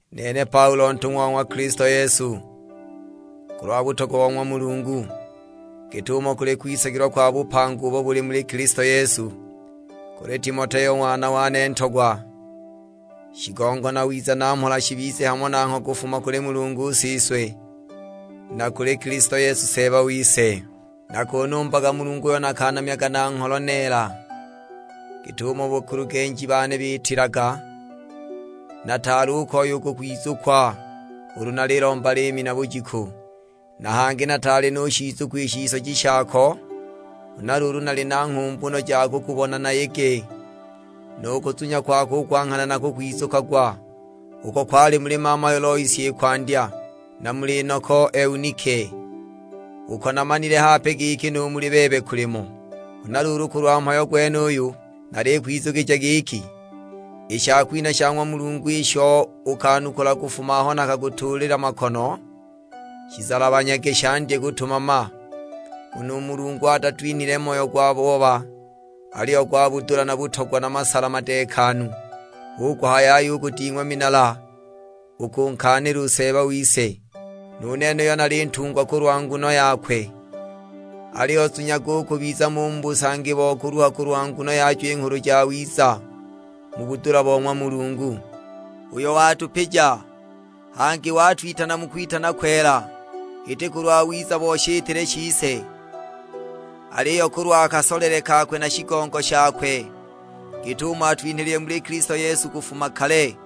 Nene Paulo ntung'wa wa ng'wa Kilisto Yesu, kulwa butogwa bo ng'wa Mulungu, git'umo kuli kwisagilwa kwa bupanga ubo buli muli Kilisto Yesu. Kuli Timoteo ng'wana wane ntogwa. Shigongo na wiza na mhola shibize hamo nangho kufuma kuli Mulungu Siswe, na kuli Kilisto Yesu Seeba wise. Nakunumbaga Mulungu uyo nakanamyaga na ngholo neela, git'umo bakulugenji bane biitilaga. Nataali u koya u kukwizukwa ulu nalilomba liimi na bujiku. Na hangi nataali nushizukwa i shisoji shako, huna luulu nali na nghumbu no ja kukubona nayege. Nu kuzunya kwako u kwa nghana nakukwizukagwa, uko kwali muli mamayo Loisi i kwandya, na muli noko Eunike; uko namanile hape giki nu muli bebe kulimo. Huna luulu kulwa mhayo gwenuyu, nalikwizukija giki, i shakwinha sha ng'wa Mulungu isho ukanukula kufuma aho nakakutuulila makono, shizalabanyage shandye kutumama. Nguno u Mulungu atatwinhile moyo gwa booba, aliyo gwa budula na butogwa na masala madeekanu. Hu kuhaya yaya u kuding'wa minala u kunkaanila u Seeba wise, nu nene uyo nali ntungwa kulwa nguno yakwe; aliyo zunyaga u kubiza mo u mu busangi bo kuluha kulwa nguno yajo i Nghulu Jawiza, mu budula bo ng'wa Mulungu, uyo watupija. Hangi watwitana mu kwitana kwela, iti kulwa wiza bo shitile shise; aliyo kulwa kasolele kakwe na shigongo shakwe, git'umo atwinhilile muli Kilisto Yesu kufuma kale,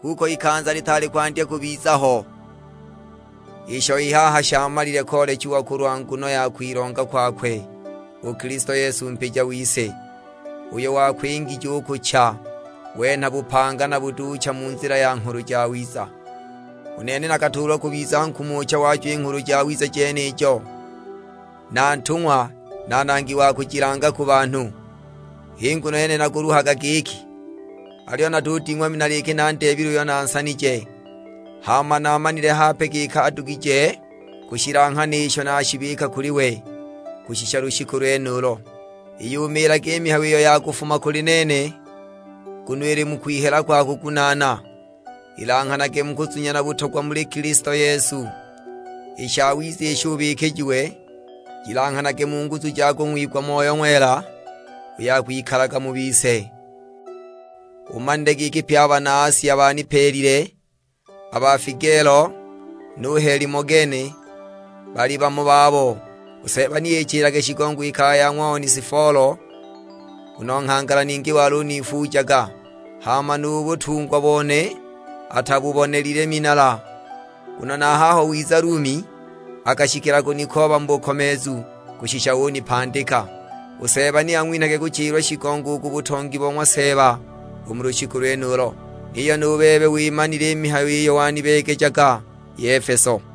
kuko ikanza litaali kwandya kubiza ho. Isho i haha shamalile koolechiwa kulwa nguno ya kwilonga kwakwe u Kilisto Yesu mpija wise, uyo wakwingije u kucha, wenha bupanga na butuucha mu nzila ya Nghulu Jawiza. U nene nakatuulwa kubiza nkumucha wajo i Nghulu Jawiza jenijo, na ntung'wa na nangi wa kujilanga ku banhu. H'i nguno yene nakuluhaga giki; aliyo natuding'wa minala iki nandeebile uyo nansanije, hama namanile hape giki adugije kushilanghana isho nashibika kuli we, kushisha lushiku lwenulo. Iyumiilage i mihayo iyo wa kufuma kuli nene, nguno ili mu kwihela kwa kugunaana, ilanghanage mu kuzunya na butogwa muli Kilisto Yesu. I shawiza isho ubikijiwe, shilanghanage mu nguzu ja ngwiyigwa Moyo Ng'wela uyo akwikalaga mu bise. Umanile giki pye a bana Asia banipeelile, a ba Figelo na Helimogene bali bamo babo! U Seeba ni ichilage shigongo i kaya ya ng'wa Onesifolo, nguno nghangala ningi waluniifuujaga, hama nu butungwa bone atabubonelile minala. Nguno na a haho wiza Lumi akashikila kunikooba mu bukomeezu, kushisha unipandika. U Seeba ni ang'winhage kuchilwa shigongo u ku butongi bo ng'wa Seeba u mu lushiku lwenulo. Niyo nu bebe wimanile i mihayo iyo wanibeegejaga i Efeso.